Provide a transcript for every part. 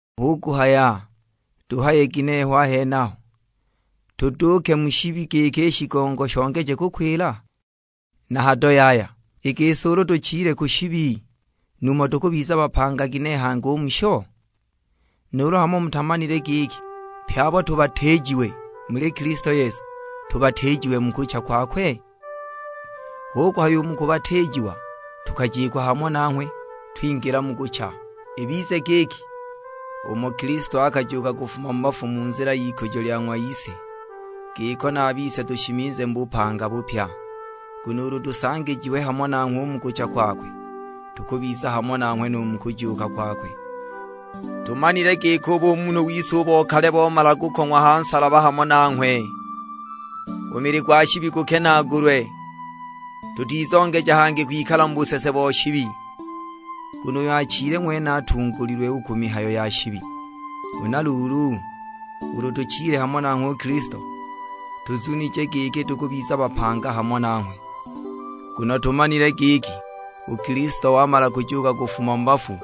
Hu kuhaya tuhaye ginehe ho a henaho, tuduuke mu shibi giki i shigongo shongeje kukwila? Na hado yaya; i gisi ulu tuchile u ku shibi, numho tukubiza bapanga ginehe hangi u musho? Nuulu hamo mutamanile giki pye abo tubatiijiwe muli Kilisto Yesu, tubatiijiwe mu kucha kwakwe? Hu kuhaya u mu kubatiijiwa tukajikwa hamo nanghwe twingila mu kucha; ibize giki, umo Kilisto akajuuka kufuma mu bafu mu nzila y'ikujo lya ng'wa Ise, giko na a bise tushimizile mu bupanga bupya. Nguno ulu tusangijiwe hamo nanghwe u mu kucha kwakwe, tukubiza hamo nanghwe nu mu kujuuka kwakwe. Tumanile giki u bumunhu wise u bo kale bomala kukong'wa ha nsalaba hamo nanghwe, u mili gwa shibi gukenaagulwe, tutizongeja hangi kwikala mu busese bo shibi. Nguno uyo achile ng'wene atungulilwe u ku mihayo ya shibi. Huna luulu, ulu tuchile hamo nanghwe u Kilisto, tuzunije giki tukubiza bapanga hamo nanghwe. Nguno tumanile giki u Kilisto wamala kujuuka kufuma mu bafu,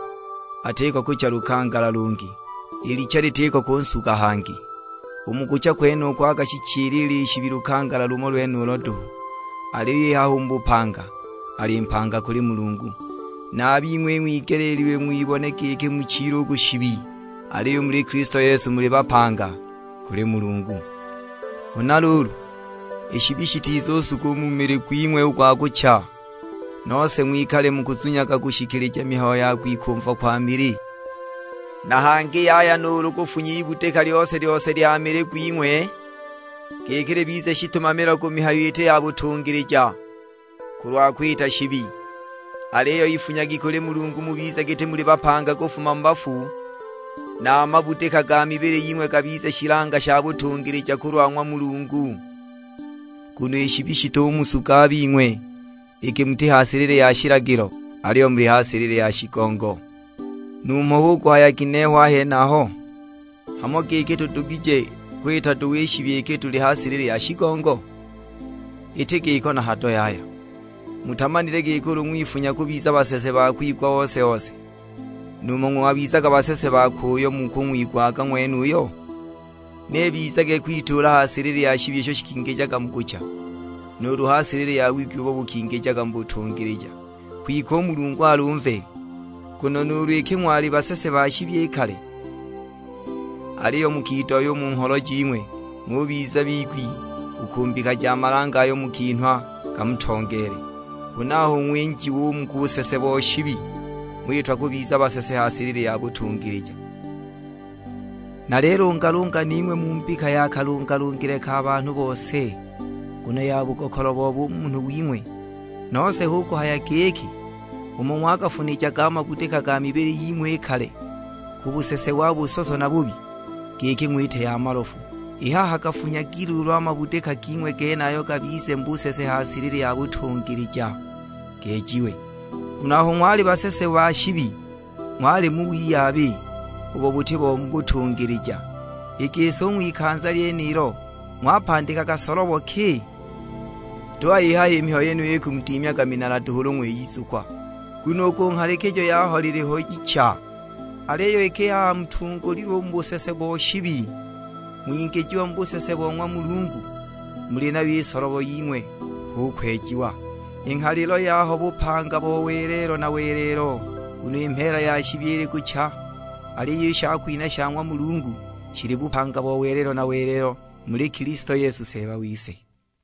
atiko kucha lukangala lungi, i licha litiko kunsuga hangi. U mu kucha kwenuko akashichilila i shibi lukangala lumo lwenulo duhu, aliyo i haha u mu bupanga, ali mpanga kuli Mulungu. Na a bing'we ing'wigeleelilwe ng'wibone giki muchile u ku shibi, aliyo u muli Kilisto Yesu muli bapanga kuli Mulungu. Huna luulu, i shibi shitizusuga u mu mili gwing'we u gwa kucha, nose ng'wikale mukuzunyaga kushikilija mihayo ya kwikumva kwa mili. Na hangi yaya nuulu kufunya ibudika lyose-lyose lya mili gwing'we, giki libize shitumamilo ku mihayo iti ya butungilija, kulwa kwita shibi. Aliyo ifunyagi kuli Mulungu, mubize giti muli bapanga kufuma mu bafu, na a mabudika ga mibili ying'we gabize shilanga sha butungilija kulwa ng'wa Mulungu. Nguno i shibi shitumusuga a bing'we, iki muti ha silili ya shilagilo, aliyo muli ha silili ya shigongo. Numho hu kuhaya ginehe ho a henaho? Hamo giki tudugije kwita duhu i shibi, iki tuli ha silili ya shigongo? Iti giko na hado yaya! Mutamanile giki ulu ng'wifunya kubiza basese ba kung'wigwa ose-ose, numho ng'wabizaga basese bakwe uyo mukung'wigwaga ng'wenuyo? Ni ibizage kwituula ha silili ya shibi isho shikingijaga mu kucha, nuulu ha silili ya wigwi ubo bukingijaga mu butungilija! Kwike u Mulungu alumve, nguno nuulu iki ng'wali basese ba shibi i kale, aliyo mukidohya u mu ngholo jing'we ng'ubiza bigwi u ku mbika ya malange ayo mukinhwa gamutongeele. Huna aho ng'winjiwa u mu busese bo shibi, ng'witwa kubiza basese ha silili ya butungilija. Nalilungalunga ning'we mu mbika ya kalungalungile ka banhu bose, nguno ya bugokolo bo bumunhu wing'we. Nose hu kuhaya giki, umo ng'wagafunijaga a mabudika ga mibili ying'we i kale ku busese wa busoso na bubi, giki ng'wite ya malofu, i haha gafunyagi luulu a mabudika ging'we genayo gabize mu busese ha silili ya butungilija, gejiwe. Nguno aho ng'wali basese ba shibi ng'wali mu wiyabi, ubo buti bo mu butungilija. I gisi u ng'wikanza lyenilo ng'wapandikaga solobo ki? Tuhaya i haha i mihayo yeniyo ikumudimyaga minala duhu ulu ng'wiyizukwa, nguno u ku nghalilo yaho liliho icha! Aliyo iki i haha mutungulilwe u mu busese bo shibi, ng'wingijiwa mu busese bo ng'wa Mulungu, muli nayo i solobo ying'we; hu kwejiwa, i nghalilo yaho bupanga bo welelo na welelo. Nguno i mheela ya shibi ili kucha, aliyo i shakwinha sha ng'wa Mulungu, shili bupanga bo welelo na welelo muli Kilisto Yesu Seeba wise.